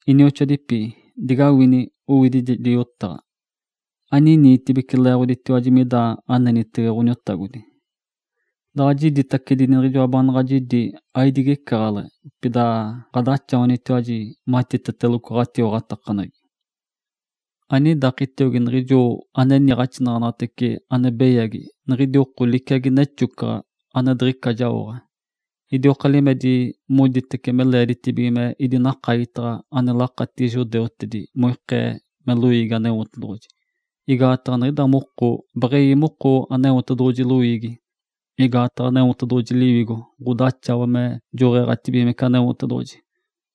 Inioxoadipi, digawini owidijedi yotaɡ̶a. Aniniitibeci leeɡ̶oditiwaji mida anenitege Ǥoniotagodi. Daɡ̶a jiditace niɡ̶ijoa baanaɡ̶a jidi, aidigecaɡ̶aleɡ̶e, pida ɡ̶adaxawanitiwaji matiteteloco ɡ̶atiwaɡ̶atakaneɡ̶egi. Anidakitiogi niɡ̶ijo ane niiɡ̶axinaɡ̶anaɡ̶atece ane beyagi, niɡ̶idi oko liciagi necexodi (ane diɡ̶ica jaoɡ̶a), idioka limedi moditibece me leeditibige me idinakagitaɡ̶a ane lakatigi judeutedi moikee me loiigi Aneotedoɡ̶oji. Igaataɡ̶a niɡ̶ida moko beɡ̶ewi moko Aneotedoɡ̶oji loiigi. Igaataɡ̶a Aneotedoɡ̶oji Liwigo ɡ̶odaxawa me joɡ̶eeɡ̶atibigimece Aneotedoɡ̶oji,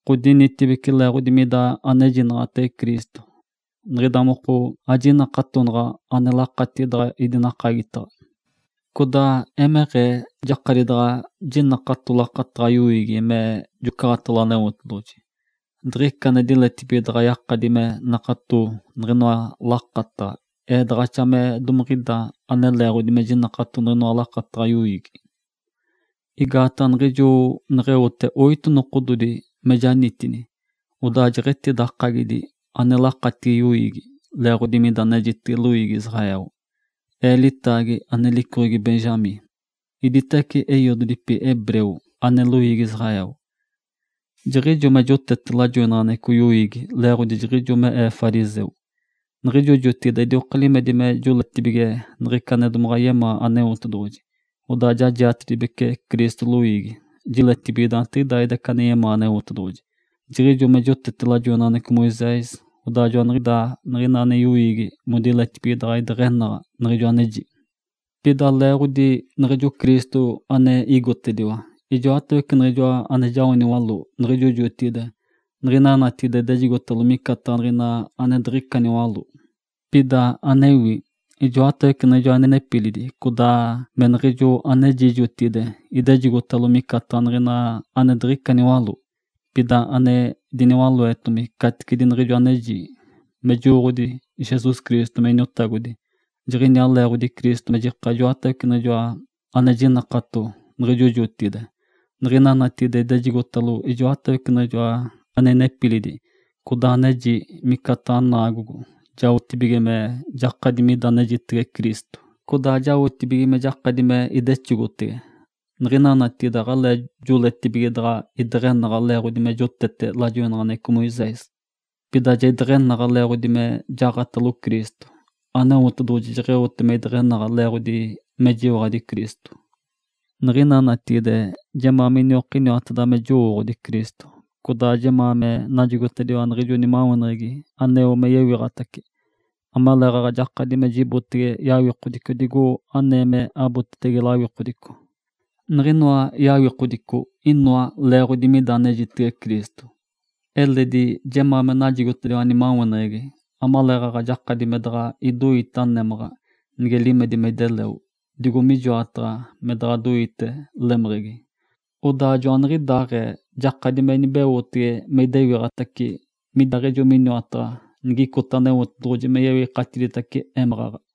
ɡ̶odinitibece leeɡ̶odi mida anejinaɡ̶atege Cristo. Niɡ̶ida moko ajinakatonaɡ̶a ane lakatigi daɡ̶a idinakagitaɡ̶a. Codaa emeɡ̶ee jakadi daɡ̶a jinakato lakataɡ̶a yoiigi me jocaɡ̶atalo Aneotedoɡ̶oji. Diɡ̶ica ane diletibige daɡ̶a yakadi me nakato niɡ̶inoa lakataɡ̶a, ee daɡ̶axatace me domiɡ̶ida ane leeɡ̶odi me jinakato niɡ̶inoa lakataɡ̶a yoiigi. Igaataɡ̶a niɡ̶ijo neɡ̶eote oito nokododi me janitini, odaa jeɡ̶etidakagi ane lakatigi yoiigi, leeɡ̶odi mida anejitege loiigi Israel. Ee litaagi ane licoɡ̶egi Benjamim. Iditawece eiododipi hebreu (ane loiigi Israel). Jiɡ̶ijo me jotete lajoinaɡ̶aneɡ̶eco yoiigi leeɡ̶odi jiɡ̶ijo me ee fariseu. Niɡ̶ijo jotigide idioka limedi me joletibige niɡ̶ica ane domaɡ̶a yemaa Aneotedoɡ̶oji, odaa ja jiatetibece Cristo loiigi (jiletibige daantiɡ̶idaaɡ̶ida ica ane yemaa Aneotedoɡ̶oji). Jiɡ̶ijo me jotete lajoinaɡ̶aneɡ̶eco Moisés. Odaa joaniɡ̶idaa niɡ̶ina ane yoiigi modiletibige daɡ̶a ideɡ̶enaɡ̶a niɡ̶ijo aneji. Pida leeɡ̶odi niɡ̶ijo Cristo ane igotediwa, ijoatawece niɡ̶ijoa ane jao niwaló niɡ̶ijo jotigide, niɡ̶ina natigide idejigotalo micataɡ̶a niɡ̶ina ane diɡ̶ica niwaló. Pida anewi, ijotawece niɡ̶ijo ane inepilidi codaa me niɡ̶ijo aneji jotigide idejigotalo micataɡ̶a niɡ̶ina ane diɡ̶icata niwaló. Pida ane diniwaloetomi caticedi niɡ̶ijo aneji, me jowooɡ̶odi Jesus Cristo me Iniotagodi. Jiɡ̶ijaa leeɡ̶odi Cristo me jika ijoatawece niɡ̶ijoa ane jinakato niɡ̶ijo jotigide, niɡ̶ina natigide idejigotalo ijoatawece niɡ̶ijoa ane inepilidi codaa aneji micataɡ̶a niɡ̶ina naagogo, jaotibige me jakadi mida anejitege Cristo, codaa jaotibige me jakadi me idexogotege. Niɡ̶ina natigide aɡ̶alee joletibige daɡ̶a ideɡ̶enaɡ̶a leeɡ̶odi me jotete lajoinaɡ̶aneɡ̶eco Moisés. Pida ja ideɡ̶enaɡ̶a leeɡ̶odi me jaɡ̶atalo Cristo. Aneotedoɡ̶oji jeɡ̶eote me ideɡ̶enaɡ̶a, leeɡ̶odi mejiwaɡ̶adi Cristo. Niɡ̶ina natigide jemaa miniokiniwateda me jowooɡ̶odi Cristo, codaa jemaa me najigotediwa niɡ̶ijo nimaweneɡ̶egi aneo me yewiɡ̶atace, amaleeɡ̶aɡ̶a jakadi me jibotege yawikodico digo anee me abotetege lawikodico. Niɡ̶inoa yawikodico inoa leeɡ̶odi mida anejitege Cristo. Eledi jemaa me najigotediwa nimaweneɡ̶egi amaleeɡ̶aɡ̶a jakadi me daɡ̶a idoitege némaɡ̶a nige limedi me ideleo, digo mijoataɡ̶a me daɡ̶a doitetege lemeɡ̶egi. Odaa joaniɡ̶idaaɡ̶ee jakadi me inibeotege me idewiɡ̶atace midiaaɡ̶ejo miniwataɡ̶a, nigicota Aneotedoɡ̶oji me yewikatiditace émaɡ̶aɡ̶a.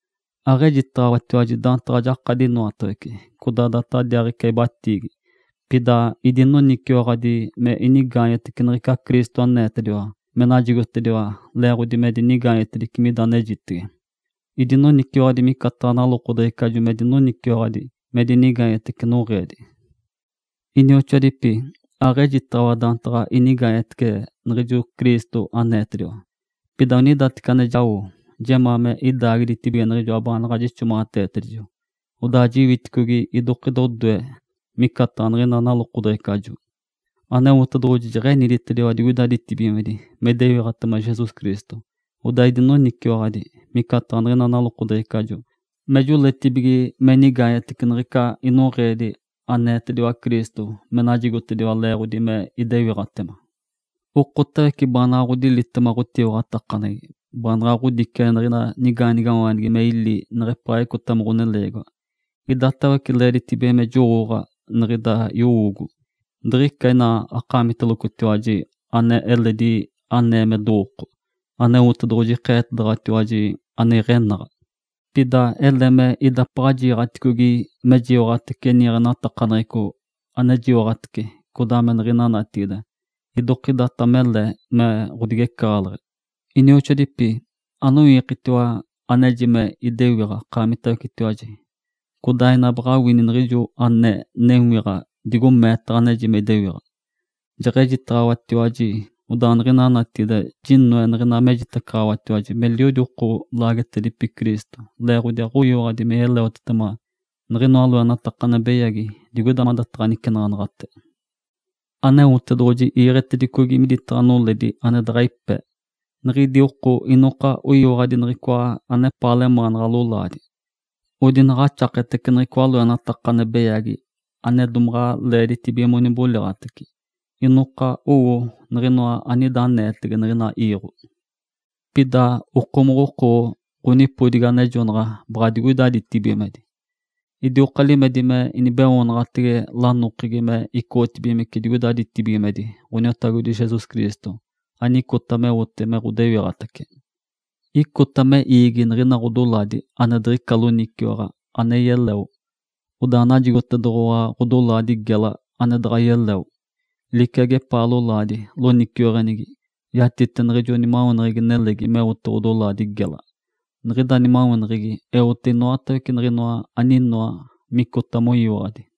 Aɡ̶ejitaɡ̶awatiwaji daantaɡ̶a jakadi inoatawece, codaa daaditaɡ̶adiaaɡ̶ica ibatiigi. Pida idinoniciwaɡ̶adi me inigaanyetece niɡ̶ica Cristo aneetediwa me najigotediwa leeɡ̶odi me dinigaanyetedici mida anejitege. (Idinoniciwaɡ̶adi micataɡ̶a nalokodeɡ̶ecajo me dinoniciwaɡ̶adi me dinigaanyetece noɡ̶eedi.) Inioxoadipi, aɡ̶eji daantaɡ̶a inigaanyetece niɡ̶ijo Cristo aneetediwa. Pida onidateci ane jao, jemaa me idaagiditibige niɡ̶ijoa baanaɡ̶a jixomaɡ̶ateetedijo, codaa jiwiticogi idokida odoe. (Micataɡ̶a niɡ̶ina nalokodeɡ̶ecajo.) Aneotedoɡ̶oji jeɡ̶eniditediwa digoida ditibigimedi me idewiɡ̶atema Jesus Cristo, odaa idinoniciwaɡ̶adi (micataɡ̶a niɡ̶ina nalokodeɡ̶ecajo) me joletibige me inigaanyetece niɡ̶ica inoɡ̶eedi, aneetediwa Cristo me najigotediwa leeɡ̶odi me idewiɡ̶atema. Okotawece baanaɡ̶a ɡ̶odilitema ɡ̶otiwaɡ̶atakaneɡ̶egi, baanaɡ̶a ɡ̶odiciagi niɡ̶ina nigaanigawaanigi me ili nigepaa icota me ɡ̶oneleegiwa, idatawece leeditibige me jowooɡ̶a niɡ̶ida yowoogo. Diɡ̶ica ina akaamitelocotiwaji ane eledi anee me dowooko, Aneotedoɡ̶oji ikeetedaɡ̶awatiwaji ane iɡ̶enaɡ̶a. Pida ele me idapaɡ̶a jiiɡ̶aticogi mejiwaɡ̶atece niiɡ̶enatakaneɡ̶eco, anejiwaɡ̶atece codaa niɡ̶ina natigide, idokidata mele me ɡ̶odigecaɡ̶aleɡ̶e. Inioxoadipi, anowiikitiwa aneji me idewiɡ̶a akaamitawecetiwaji, codaa ina baɡ̶a awini niɡ̶ijo ane newiɡ̶a digo meetaɡ̶a aneji me idewiɡ̶a. Jeɡ̶ejitaɡ̶awatiwaji, odaa niɡ̶ina natigide jinoe niɡ̶ina mejitacaɡ̶awatiwaji meliodi oko lakapetedipi Cristo, leeɡ̶odi aɡ̶oyiwaɡ̶adi me yeleotetema niɡ̶inoa loenataka ane beyagi digoida mada nicenaɡ̶anaɡ̶ate. Aneotedoɡ̶oji iiɡ̶etedicogi minitaɡ̶a noledi ane daɡ̶a ipe. Niɡ̶idi oko inoka oyiwaɡ̶adi niɡ̶icoa anepaa lemaanaɡ̶a lolaadi. Odinaɡ̶axaketece niɡ̶icoa loenataka ane beyagi ane domaɡ̶a leeditibige moniboliɡ̶atece. Inoka oyowo niɡ̶inoa anida aneetege niɡ̶ina iiɡ̶o. Pida okomoɡ̶oko ɡ̶onipodigi anejonaɡ̶a baɡ̶a digoida ditibigimedi. Idioka limedi me inibeoonaɡ̶atege lanokegi me icoɡ̶otedibigimece digoida ditibigimedi, Ǥoniotagodi Jesus Cristo anicota meote me ɡ̶odewiɡ̶atace. Icota me iigi niɡ̶ina ɡ̶odolaadi ane diɡ̶ica loniciwaɡ̶a, ane yeleo, odaa najigotedoɡ̶owa ɡ̶odolaadi gela ane daɡ̶a yeleo, liciagi epaa lolaadi loniciweɡ̶enigi. Yatite niɡ̶ijo nimaweneɡ̶egi nelegi meote ɡ̶odolaadi gela. Niɡ̶ida nimaweneɡ̶egi eote inoatawece niɡ̶inoa aninoa micota moyiwaɡ̶adi.